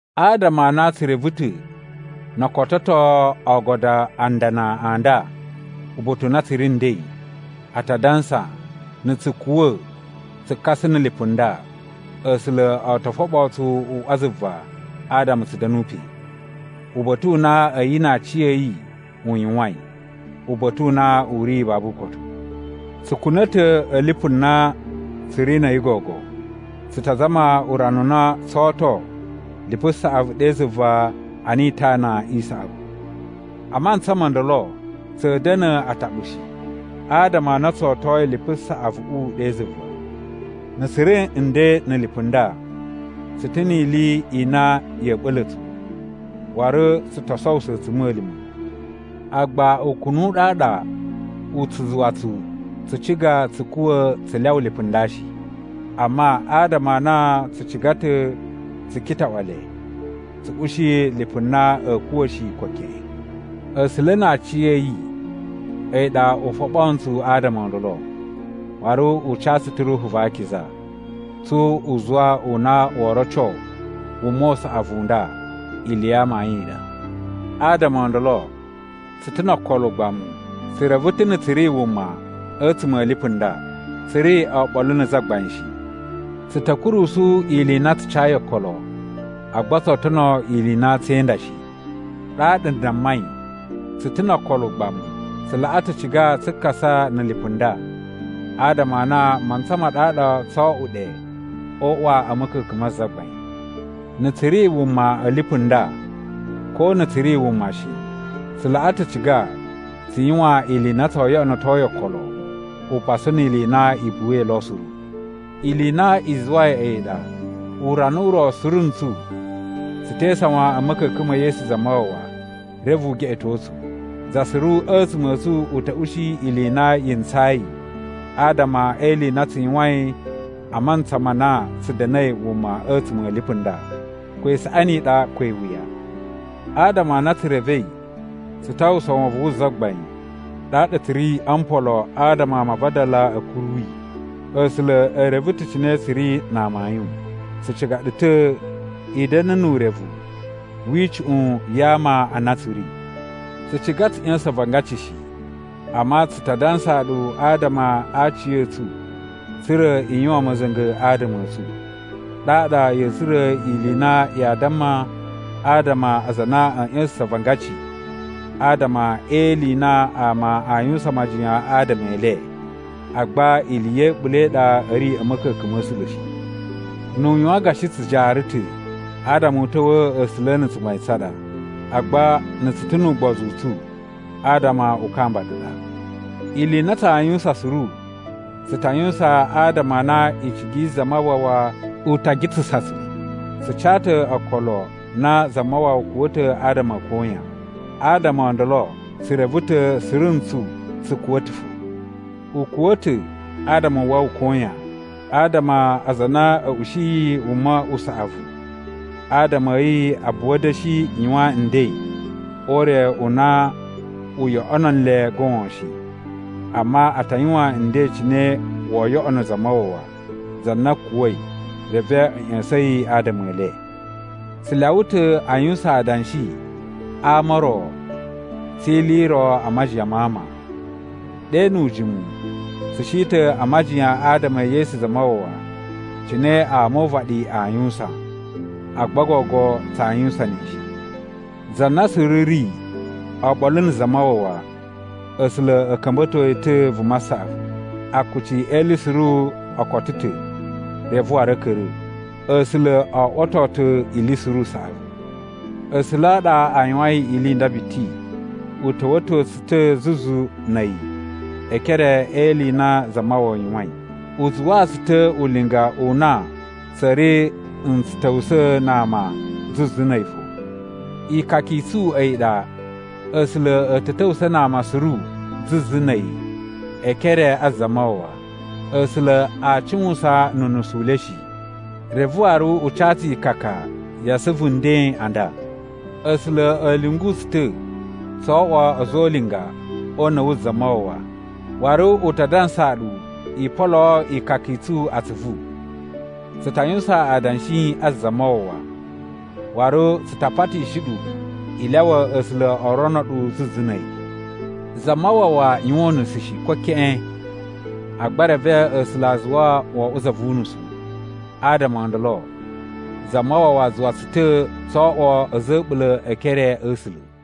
Adama a na tsu reve ta̱ no o kototo oogodo a ndana a nda uba̱ta̱ u na tsu ri nden, a ta dansa, na̱ tsu kuwa̱ tsu kasa na̱ lipu nda, A̱sula̱ o to foɓoo tsu uꞌwa zuva adama tsu da̱nu pe. Uba̱ta̱ u na a̱yi na aciya̱yi u yuwain, uba̱ta̱ u na u ri babu ukotu. Tsu kuna̱ ta̱ a̱ lipu na tsu ri na̱ a̱yi gogo, tsu ta zama urana u na tsoo oto lipu saꞌavu ɗe zuva ana itana i saꞌavu. A mantsa mo ndolo tsa̱a̱ da̱na̱ ataɓu shi, adama a na tso otoi lipu saꞌavuꞌu ɗe zuva. Na̱ tsu ri nden na̱ lipu nda, tsu ta̱ ni ili i na ya̱ ɓa̱la̱ tsu, waru tsu to sowuso a̱tsuma̱lima̱. Agba ukunu u ɗaɗa u tsu zuwa tsu tsu ciga tsu kuwa̱ tsu lyawa lipu nda shi. Amma adama a na tsu ciga ta̱ tsu kitaꞌwa le tsu ushi lipu na a̱a̱ kuwa̱ shi, ko keꞌen. A̱sula̱ na aciya̱yi a̱yi ɗa u foɓo ntsu adama o ndolo, waru u ca tsu ta̱ Ruhu va Akiza, tsu uzuwa u na woo roco wuma u saꞌavu u nda ili ya amayun i ɗa. Adama o ndolo, tsu ta̱ no okolo ugbamu. Tsu reve ta̱ na̱ tsu ri wuma a̱tsuma̱ a̱ lipu nda, tsu ri oɓolo na̱ Zagbain shi. Tsu ta̱ kurusu ili i na tsu cayi okolo, agba tsoo tono ili i na tsee inda shi. Ɗaɗa n dammai tsu ta̱ no okolo ugbamu. Tsu laꞌa ta̱ ciga tsu kasa na̱ lipu nda adama a na a mantsa ma ɗaɗa tsoo oꞌwo ɗe o uꞌwa a̱ ma̱ka̱ka̱n ma Zagbain. Na̱ tsu ri wuma a̱ lipu nda, ko na̱ tsu ri wuma shi, tsu laꞌa ta̱ ciga tsu yuwan ili i na tsoo yoꞌonoto yi okolo upasu ni ili i na i buwai lo suru. Ili i na i zuwai a̱yi ɗa urana u ro suru ntsu tsu tee isawan a̱ ma̱ka̱ka̱n ma̱ Yesu Zamawawa reve u geꞌeto tsu. Za suru a̱tsuma̱ a̱ tsu u ta̱ ushi ili i na yi ntsayi adama e ili i na tsu yuwain a mantsa ma na tsu da̱na̱i wuma a̱tsuma̱ a̱ lipu nda, ko isaꞌani i ɗa ko iwuya. Adama a na tsu revei tsu ta uwwusa wovon wu Zagbain, ɗaɗa tsu ri o mpolo adama ama a vadala a̱ kuru yi. A̱sula̱ e reve ta̱ cine tsu ri na amayun. Tsu ciga ɗu ta̱ i da̱na̱ nu urevu wi icuꞌun ya ama a na tsu ri. Tsu ciga tsu ꞌya̱sa̱n avangaci shi, amma tsu ta dansaa ɗu adama a aciya̱tsu tsa̱ra̱ i yuwan ma̱za̱nga̱ adama a̱ tsu. Ɗaɗa ya̱a̱ tsura̱ ili i na yaa damma adama a aza a na a̱a̱ ꞌya̱sa̱sa̱n avangaci adama e ili i na ama a yuwusan majiyan adama e le, agba ili ya̱ a̱ɓula̱ i ɗa a̱ ri a̱ ma̱ka̱ka̱n ma̱ A̱sula̱ shi. Nu u yuwan gashi tsu jaara ta̱, adama u ta̱wa̱a̱ A̱sula̱ na̱ tsugbain tsa ɗa. Agba na̱ tsu ta̱ nu ugbozu u tsu, adama u kamba ɗu ɗa. Ili i na tsaa yuwusan suru tsu ta yuwusan adama a na icigi yi Zamawawa u ta gitsasa tsu. Tsu ca ta̱ okolo na Zamawawa kuwa̱ ta̱ adama a̱ koyan, adama o ndolo tsu reve ta̱ suru ntsu tsu kuwa̱ ta̱ fo. U kuwa̱ ta̱ adama u wawa koyan, adama aza a na a̱ ushiyi wuma u saꞌavu adama a̱ yi a buwa da̱shi yuwan nden o ure u na u yoꞌono nle goon shi. Amma, a ta yuwan nden cine woo yoꞌono Zamawawa, za na kuwa̱i reve a̱ ꞌya̱sa̱n yi adama e le. Tsu lyawa ta̱ a yuwusan adanshi a ama o ro tsi ili i ro a majiyan ma ama. Ɗe nu ujimu, tsu shi ta̱ a majiyan adama e Yesu Zamawawa cine ama o uvaɗi aa yuwusan, agba gogo tsaa yuwusan ne shi. Za na suru ri oɓolo na̱ Zamawawa, A̱sula̱ a̱ ka̱mba̱to yi ta̱ vuma saꞌavu. Akuci e ili suru o koto ta̱ reve waru a̱ ka̱ra̱. A̱sula̱ o oꞌwoto ta̱ ili suru usaꞌavu. A̱sula̱ a ɗa a yuwain ili nda biti. U ta̱wa̱to tsu ta̱ zuzu na̱ a̱yi e ekere e ili i na Zamawawa yuwain. U zuwaa tsu ta̱ ulinga u na tsa̱a̱ ri n tsu ta̱wusa̱ na ama zuzu na̱ a̱yi fo. Ikaka i tsu a̱yi ɗa A̱sula̱ a̱ ta̱ ta̱wusa̱ na ama suru zuzu na̱ a̱yi e ekere a Zamawawa. A̱sula̱ aa cuwusan nu unusu u le shi. Reve waru u ca tsu ikaka ya asuvu nden a nda. A̱sula̱ a̱ lyungu tsu ta̱ tso oꞌwo a̱za̱ o ulinga o una̱ wu Zamawawa, waru u ta dansaa ɗu i poloo ikaka i tsu atsuvu. Tsu ta yuwusan adanshi a Zamawawa, waru tsu ta patishi ɗu i lyawa A̱sula̱ o rono ɗu zuzu na̱ a̱yi. Zamawawa yuwan unusu shi, ko keꞌen! Agba reve A̱sula̱ a zuwa wo oꞌwo za vu unusu, adama o ndolo Zamawawa zuwa tsu ta̱ tso oꞌwo a̱za̱ a̱ a̱ɓula̱ e ekere a̱ A̱sula̱.